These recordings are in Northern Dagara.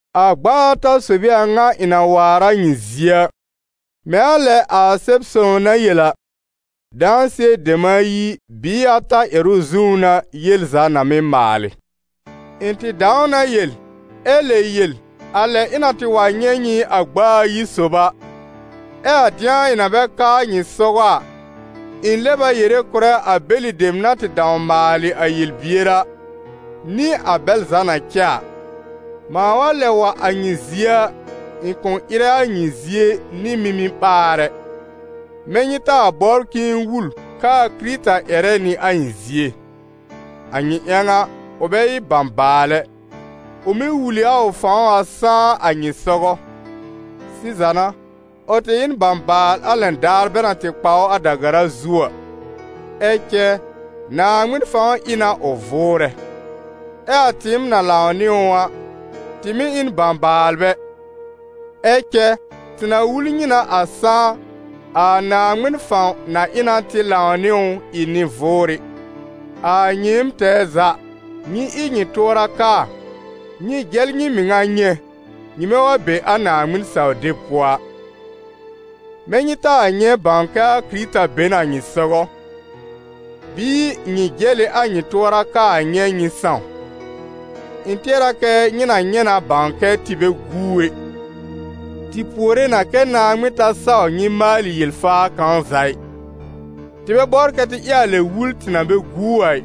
A gb'a ata sob ɩ a ŋa ɩ̃ na waar a nyɩ zie a. Mɛ̃ a lɛ a Sɛb-sõw na yel a: «Dãsɩɛ dem ayi bɩɩ ata ƴɛrʋ zũú n'a yel za na mɩ́ maalɩ.» Ɩ̃ tɩ dãw na yel, ɛ lɛ yel a lɛ ɩ̃ na tɩ wa nyɛ̃ nyɩ a gb'a ayi sob a, ɛ a dɩ̃a ɩ̃ na bɛ ka a nyɩ sɔgɔ a, ɩ̃ lɛb a yere kʋ̀rɛ a bɛlɩ dem na tɩ dãw maalɩ a yel-bier a, nɩ a bɛl za na cɛ a: mãa wa lɛb wa a nyɩ zie a, ɩ̃ kʋ̃ ɩrɛ a nyɩ zie nɩ mimi-ɓaar ɛ, mɛ̃ nyɩ taa bɔbr k'ɩ̃ɩ wul k'aa Kɩrɩta ƴɛrɛ nɩ a ɩ̃ zie! A nyɩ ƴãw a, ʋ bɛ ɩ bãbaal ɛ, ʋ mɩ́ wul ɩ a ʋ fãw a sãá a nyɩ sɔgɔ. Sɩza n'a, ʋ tɩ ɩ n bãbaal a lɛn daar bɛ na tɩ kpa ʋ a da-gara zu a, ɛ cɛ Naaŋmɩn fãw ɩ na ʋ vʋʋrɛ. Ɛ a tɩɩm na lãw nɩ ʋ a, tɩ mɩ̀ ɩ n bãbaalbɛ, ɛ cɛ tɩ na wul nyɩ na a sãá, a Naaŋmɩn fãw na ɩ na tɩ lãw nɩ ʋ ɩ nɩ-vʋʋrɩ. A nyɩɩm tɛɛ za, nyɩ ɩ nyɩ tʋɔra kaa, nyɩ jɛl nyɩ mɩŋa nyɛ̃, nyɩmɛ wa be a Naaŋmɩn saw-deb pʋɔ a. Mɛ̃ nyɩ taa nyɛ̃ bãw kɛ a Yeezu Kɩrɩta be n a nyɩ sɔgɔ? Bɩɩ nyɩ jɛl ɩ a nyɩ tʋɔra kaa nyɛ̃ nyɩ sãw? Ɩ̃ tɩɛr a kɛ́ nyɩ na nyɛ̃ na bãw kɛ́ tɩ bɛ guu ɛ. Tɩ puore na kɛ́ Naaŋmɩn ta saw nyɩ maalɩ yel-faa kãw za ɩ. Tɩ bɛ bɔbr kɛ tɩ ɩ a lɛ wul tɩ na bɛ guu a ɩ,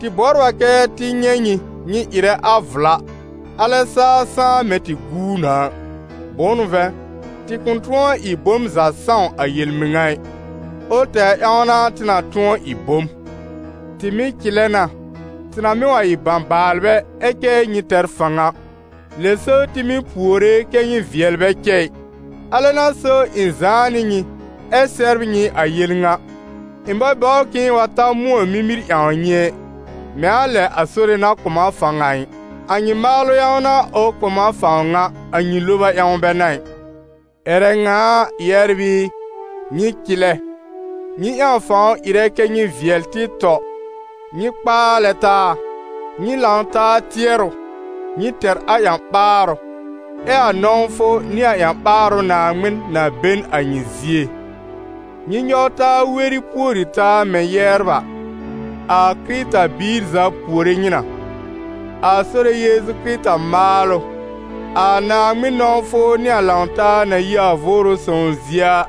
tɩ bɔbr a kɛ tɩ nyɛ̃ nyɩ, nyɩ ɩrɛ a vla, alɛ saa sãá mɛ̃ tɩ guu na a. Bʋ̃ʋ n'ʋ vɛ̃, tɩ kʋ̃ tʋ̃ɔ ɩ bom za sãw a yel-mɩŋa ɩ, ʋl tɛwr ƴãw n'a tɩ na tʋ̃ɔ ɩ bom. Tɩ mɩ̀ cɩlɛ na, tɩ na mɩ wa ɩ bãbaalbɛ ɛ cɛ nyɩ tɛr fãw a. Lɛ so tɩ mɩ́ puore kɛ́ nyɩ vɩɛl bɛ cɛ ɩ. Alɛ n'a so ɩ̃ zãá nɩ nyɩ ɛ sɛbr nyɩ a yel ŋa; ɩ̃ bɛ bɔbr k'ɩ̃ɩ wa ta mʋ̃ɔ mimir ƴãw nyɩ ɛ, mɛ̃ a lɛ a Sore na kʋ̀ m a fãw a ɩ. A nyɩ maalʋ ƴãw n'a ʋ kʋ̀ m a fãw ŋa, a nyɩ loba ƴãw bɛ n'a ɩ. Ƴɛrɛ ŋa a, yɛbr ɩ, nyɩ cɩlɛ, nyɩ ƴãw fãw ɩrɛ kɛ́ nyɩ vɩɛl tɩ tɔ, nyɩ kpaalɛ taa, nyɩ lãw-taa tɩɛrʋ, nyɩ tɛr a ƴã-ɓaarʋ, ɛ a nɔ̃wfʋ nɩ a ƴã-ɓaarʋ Naaŋmɩn na be n a nyɩ zie. Nyɩ nyɔw taa weri pùori taa mɛ̃ yɛbr a. A Kɩrɩta-biir za puore nyɩ na. A Sore Yeezu Kɩrɩta maalʋ, a Naaŋmɩn nɔ̃wfʋ nɩ a lãw-taa na yi a Vʋʋrʋ Sõw zie a,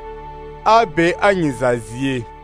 a be a nyɩ za zie.